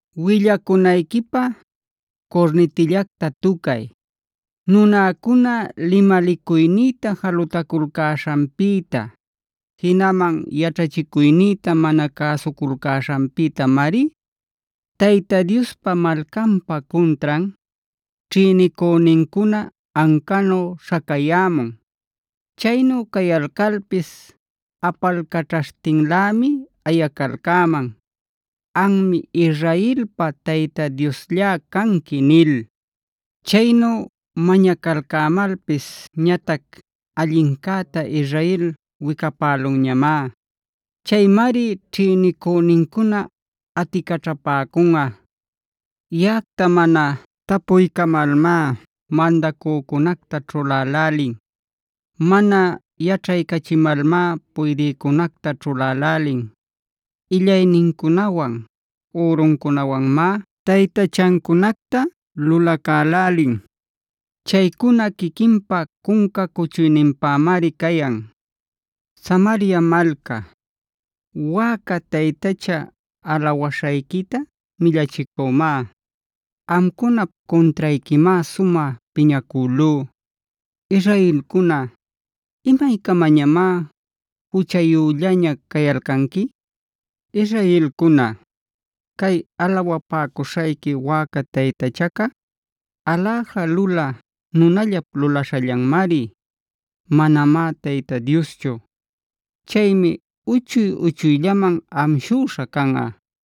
“Willacunayquipä curnitillacta tucay. Nunäcuna limalicuynïta jalutaculcäśhanpïta, jinaman yaćhachicuynïta mana cäsuculcäśhanpïtamari, Tayta Diospa malcanpa cuntran, ćhïnicünincuna ancanu śhacayämun. Chaynu cayalcalpis apalcaćhaśhtinlämi ayacalcäman: ‘Anmi Israelpa Tayta Diosllá canqui’ nil. Chaynu mañacalcämalpis ñatac allincäta Israel wicapälunñamá. Chaymari ćhïnicünincuna aticaćhapäcunꞌa. “Yaꞌacta mana tapuycamalmá mandacücunacta ćhulälälin. Mana yaćhaycachimalmá puydïcunacta ćhulälälin. Illaynincunawan, üruncunawanmá taytachancunacta lulacälälin. Chaycuna quiquinpä cunca cuchuyninpämari cayan. “Samaria malca, wäca taytachaa alawaśhayquita millachicümá.b Amcunap cuntrayquimá sumä piñacülú. Israelcuna, ¿imaycamañamá juchayüllaña cayalcanqui? Israelcuna, cay alawapäcuśhayqui wäca taytachaca, aläja lulä nunallap lulaśhallanmari. Manamá Tayta Dioschu. Chaymi uchuy-uchuyllaman amshüśha canꞌa.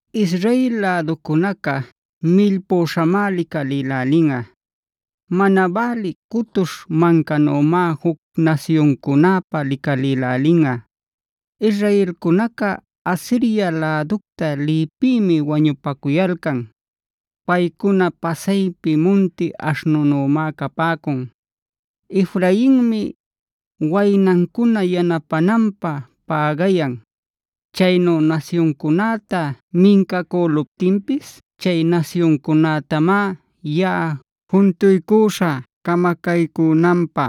Israel läducunaca millpüśhamá licalïlälinꞌa. Mana bälï cutuśh mancanümá juc nasyuncunäpä licalïlälinꞌa. Israelcunaca Asiria läducta liypïmi wañupacuyalcan. Paycuna pasaypi munti aśhnunümá capäcun. Efrainmi waynancuna yanapänanpä pägayan. Chaynu nasyuncunäta mincacüluptinpis, chay nasyuncunätamá yaꞌa juntuycuśhä camacaycünanpä.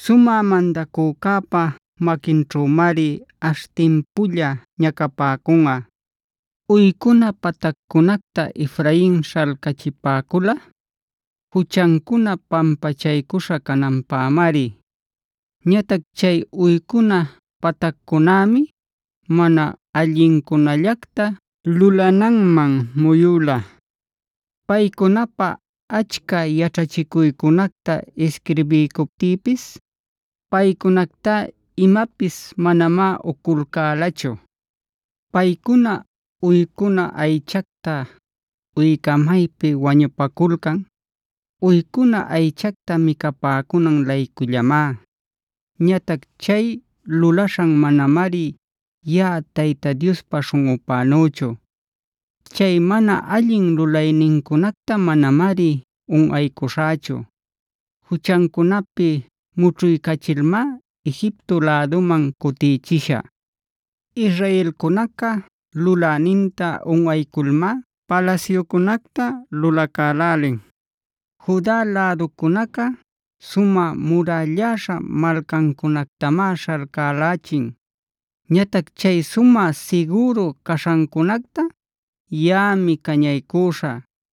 Sumä mandacücäpad maquinćhümari ash timpulla ñacapäcunꞌa. “Uycuna pataccunacta Efrain śhalcachipäcula juchancuna pampachaycuśha cananpämari. Ñatac chay uycuna pataccunämi mana allincunallacta lulananman muyüla. Paycunapä achca yaćhachicuycunacta isquirbiycuptïpis, paycunactá imapis manamá uculcälachu. Paycuna uycuna aychacta uycamaypi wañupaculcan, uycuna aychacta micapäcunan-laycullamá. Ñatac chay lulaśhan manamari yaꞌa Tayta Diospa śhunꞌupänüchu. Chay mana allin lulaynincunacta manamari unꞌaycuśhächu. Juchancunapi mućhuycachilmá Egipto läduman cutichishä. Israelcunaca luläninta unꞌayculmá palasyucunacta lulacälälin. Juda läducunaca sumä murälläśha malcancunactamá śhalcälächin. Ñatac chay sumä sigüru caśhancunacta yaꞌami cañaycüśhä.